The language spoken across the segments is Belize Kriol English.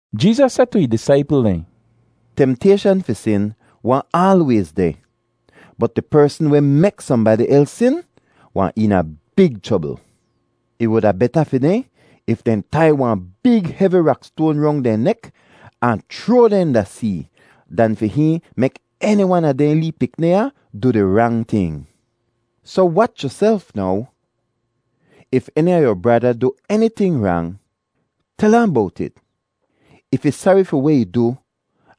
Jeezas seh tu ih disaipl dehn, “Temtayshan fi sin wahn aalwayz deh, bot di persn weh mek sohnbadi els sin wahn eena big chrobl. Ih wuda beta fi dehn if dehn tai wahn big hevi rakstoan rong dehn nek ahn chroa dehn da see dan fi hihn mek eni wan a dehn lee pikni ya du di rang ting. Soh wach yuself now. “If eni a yu brada du eniting rang, tel ahn bowt it. If ih sari fi weh ih du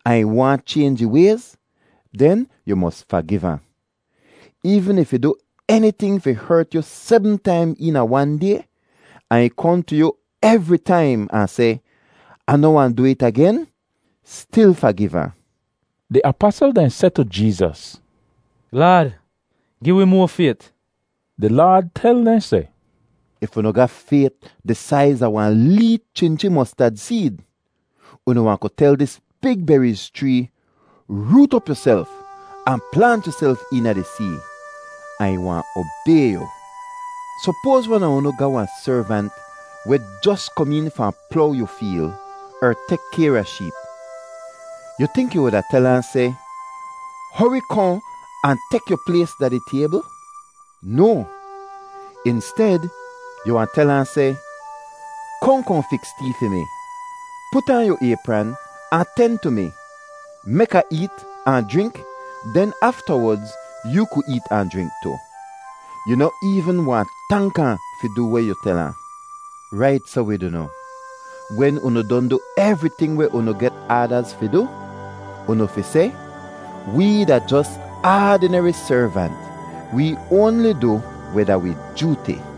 ahn ih waahn chaynj ih wayz, den yu mos fagiv ahn. Eevn if ih du eniting fi hert yu sebm taim eena wan day, ahn ih kohn tu yu evri taim ahn seh, ‘Ah noh wahn du it agen,’ stil fagiv ahn.” Di apasl dehn seh tu Jeezas, “Laad, gi wi moa fayt.” Di Laad tel dehn seh, “If unu ga fayt di saiz a wahn lee chinchi mostad seed, unu wahn ku tel dis big beriz chree, ‘Root op yuself ahn plaant yuself eena di see,’ ahn ih wahn obay yu.” “Sopoaz wan a unu ga wahn servant weh jos kom een fahn plow yu feel er tek kayr a sheep. Yu tink yu wuda tel ahn seh, ‘Hori kohn ahn tek yu plays da di taybl’? No. Insted, yu wahn tel ahn seh, ‘Kohn kohn fiks tee fi mi. Put aan yu aypran ahn ten tu mi, mek Ah eet ahn jrink; den aftawodz yoo ku eet ahn jrink tu.’ Yu noh eevn wahn tank ahn fi du weh yu tel ahn. Rait soh wid unu, wen unu don du evriting weh unu get aadaz fi du, unu fi seh, ‘Wee da jos aadineri servant; wee oanli du weh da wi jooti.’”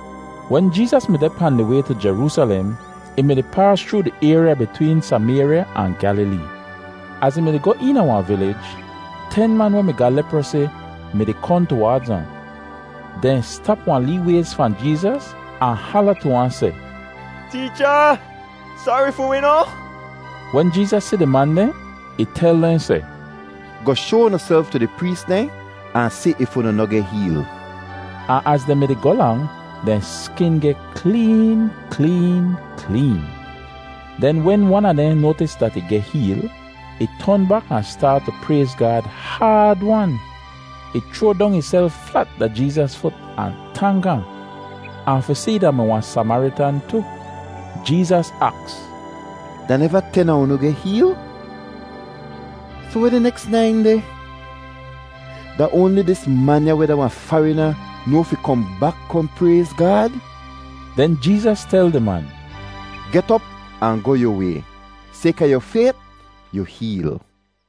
Wen Jeezas mi deh pahn di way tu Jeroosalem, ih mi-di paas chroo di ayrya bitween Samayrya ahn Gyalilee. Az ih mi-di goh eena wahn vilij, ten man weh mi ga leprosi mi-di kohn tuwaadz ahn. Dehn stap wahn lee wayz fahn Jeezas ahn hala tu ahn seh, “Teecha, sari fi wi noh!” Wen Jeezas si di man dehn, ih tel dehn seh, “Goh shoa unuself tu di prees dehn ahn si if unu noh geh heel.” Ahn az dehn mi-di goh lang, dehn skin geh kleen kleen kleen. Den wen wan a dehn noatis dat ih geh heel, ih ton bak ahn staat tu prayz Gaad haad-wan. Ih chroa dong ihself flat da Jeezas fut ahn tank ahn. Ahn fi si ih da-mi wahn Samaritan tu. Jeezas aks, “Da neva ten a unu geh heel? Soh weh di neks nain deh? Da oanli dis man ya weh da wahn farina noa fi kohn bak kohn prayz Gaad?” Den Jeezas tel di man, “Get op ahn goh yu way. Sayka yu fayt, yu heel.”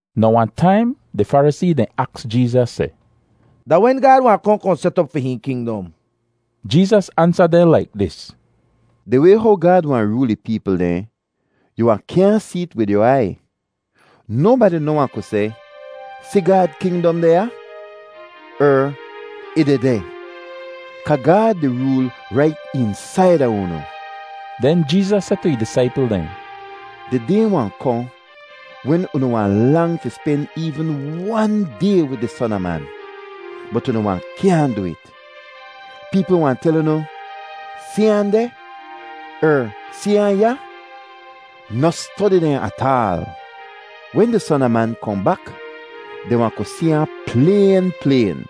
Now wahn taim di Farisee dehn aks Jeezas seh, “Da wen Gaad wahn kohn kohn set op fi hihn kingdom?” Jeezas ansa dehn laik dis: “Di way how Gaad wahn rool ih peepl dehn, yu wahn kyaahn see't wid yu aiy. Nobadi noh wahn ku seh, ‘Si, Gaad kingdom deh ya,’ er ‘Ih dehdeh.’ Kaa Gaad di rool rait eensaida unu.” Den Jeezas seh tu ih disaipl dehn, “Di day wahn kohn wen unu wahn lang fi spen eevn wan day wid di Son a Man, bot unu wahn kyaahn du it. Peepl wahn tel unu, ‘Si ahn deh!’ er ‘Si ahn ya!’ Noh stodi dehn ataal. Wen di Son a Man kohn bak, dehn wahn ku si ahn playn playn,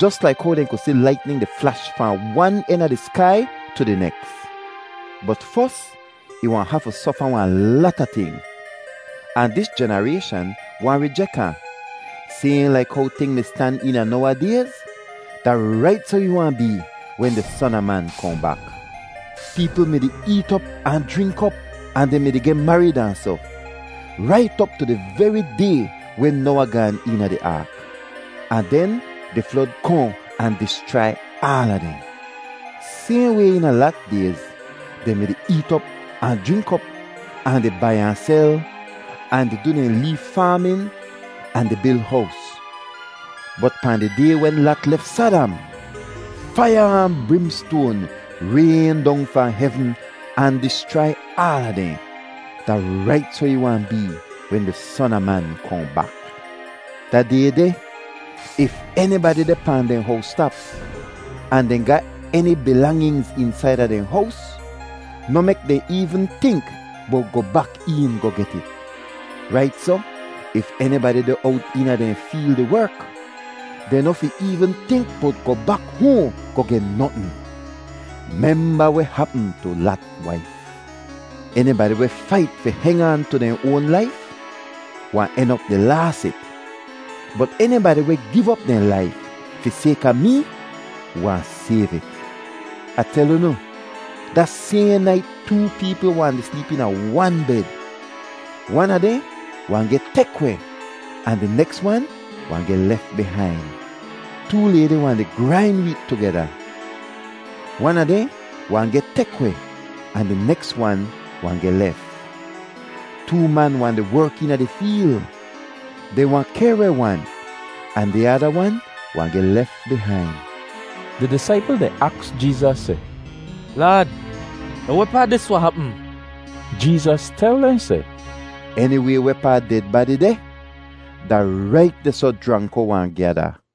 jos laik how dehn ku si laitnin di flash fahn wan en a di skai tu di neks. Bot fos ih wahn hafu sofa wahn lata ting, ahn dis jenarayshan wahn rijek ahn. “Sayhn laik how ting mi stan eena Noawa dayz, da rait soh ih wahn bee wen di Son a Man kohn bak. Peepl mi-di eet op ahn jrink op, ahn dehn mi-di geh marid ahn soh, rait op tu di veri day wen Noawa gaan eena di aak; ahn den di flod kohn ahn dischrai aala dehn. “Sayhn way eena Lat dayz, dehn mi-di eet op ahn jrink op, ahn di bai ahn sel, ahn di du dehn lee faamin ahn di bil hows. Bot pahn di day wen Lat lef Sadam, faiya ahn brimstoan rayn dong fahn hevn ahn dischrai aala dehn. “Da rait soh ih wahn bee wen di Son a Man kohn bak. Da day deh, if enibadi deh pahn dehn howstap ahn dehn ga eni bilanginz eensaida dehn hows, noh mek dehn eevn tink bowt goh bak een goh get it. Rait soh, if enibadi deh owt eena dehn feel di werk, dehn noh fi eevn tink bowt goh bak hoahn goh geh notn. Memba weh hapm tu Lat waif! Enibadi weh fait fi heng aan tu dehn oan laif wahn en op di laas it; bot enibadi weh giv op dehn laif fi sayka mee wahn sayv it. Ah tel unu, da sayhn nait too peepl wahn di sleep eena wan bed; wan a dehn wahn geh tek weh ahn di neks wan wahn geh lef bihain. Too laydi wahn di grain weet tugeda; wan a dehn wahn geh tek weh ahn di neks wan wahn geh lef. Too man wahn di werk eena di feel; dehn wahn kehr weh wan, ahn di ada wan wahn geh lef bihain.” Di disaipl dehn aks Jeezas seh, “Laad, da wehpaa dis wahn hapm?” Jeezas tel dehn seh, “Eniway wehpaa ded badi deh, da rait dehsoh jranko wahn gyada.”